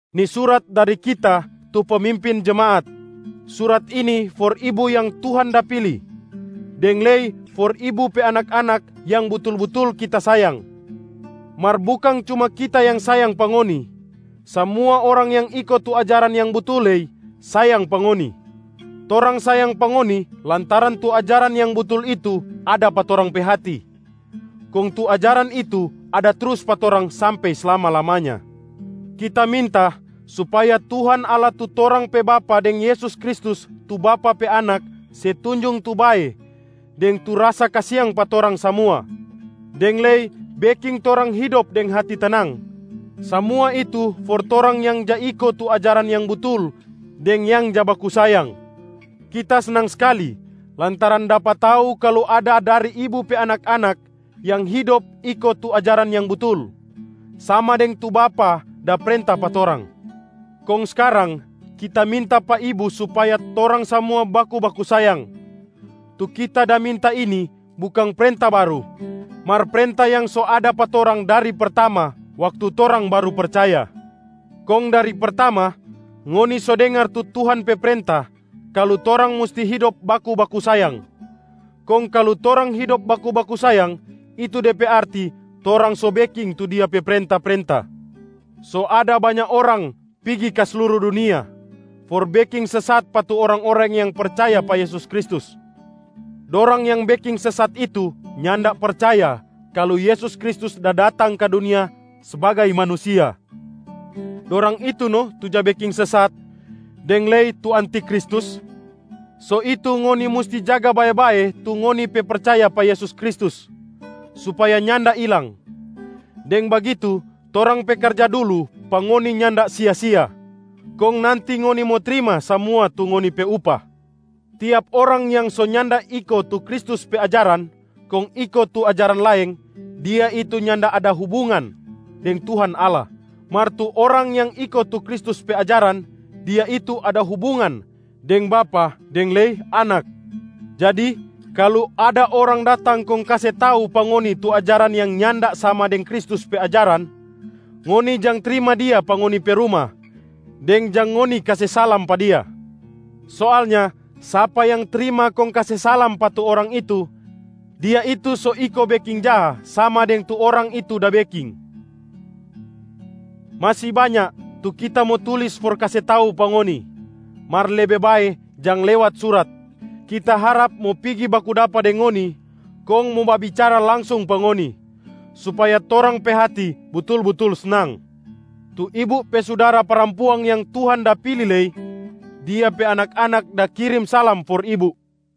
Ni surat dari kita tu pemimpin jemaat. Surat ini for ibu yang Tuhan da pili, deng lei for ibu pe anak-anak yang butul-butul kita sayang.a Mar bukang cuma kita yang sayang pa ngoni, samua orang yang iko tu ajaran yang butul lei sayang pa ngoni. Torang sayang pa ngoni lantaran tu ajaran yang butul itu ada pa torang pe hati, kong tu ajaran itu ada trus pa torang sampe slama-lamanya. Kita minta supaya Tuhan Allah tu torang pe Bapa deng Yesus Kristus tu Bapa pe Anak se tunjung tu bae deng tu rasa kasiang pa torang samua, deng lei beking torang hidop deng hati tenang. Samua itu for torang yang ja iko tu ajaran yang butul deng yang ja baku sayang. Kita snang skali lantaran dapa tau kalu ada dari ibu pe anak-anak yang hidop iko tu ajaran yang butul, sama deng tu Bapa da prenta pa torang. Kong skarang kita minta pa ibu supaya torang samua baku-baku sayang. Tu kita da minta ini bukang prenta baru, mar prenta yang so ada pa torang dari pertama waktu torang baru percaya. Kong dari pertama, ngoni so dengar tu Tuhan pe prenta kalu torang musti hidop baku-baku sayang. Kong kalu torang hidop baku-baku sayang, itu de pe arti torang so beking tu Dia pe prenta-prenta. So ada banya orang pigi ka sluru dunia for beking sesat pa tu orang-orang yang percaya pa Yesus Kristus. Dorang yang beking sesat itu nyanda percaya kalu Yesus Kristus da datang ka dunia sbagai manusia. Dorang itu no tu ja beking sesat deng lei tu antiKristus. So itu ngoni musti jaga bae-bae tu ngoni pe percaya pa Yesus Kristus supaya nyanda ilang. Deng bagitu torang pe karja dulu pa ngoni nyanda sia-sia, kong nanti ngoni mo trima samua tu ngoni pe upah. Tiap orang yang so nyanda iko tu Kristus pe ajaran kong iko tu ajaran laeng, dia itu nyanda ada hubungan deng Tuhan Allah. Mar tu orang yang iko tu Kristus pe ajaran, dia itu ada hubungan deng Bapa deng lei Anak. Jadi kalu ada orang datang kong kase tau pa ngoni tu ajaran yang nyanda sama deng Kristus pe ajaran, ngoni jang trima dia pa ngoni pe ruma deng jang ngoni kase salam pa dia. Soalnya sapa yang trima kong kase salam pa tu orang itu, dia itu so iko beking jaha sama deng tu orang itu da beking. Masi banya tu kita mo tulis for kase tau pa ngoni, mar lebe bae jang lewat surat. Kita harap mo pigi baku dapa deng ngoni kong mo babicara langsung pa ngoni, supaya torang pe hati butul-butul snang. Tu ibu pe sudara parampuang yang Tuhan da pili lei, dia pe anak-anak da kirim salam for ibu.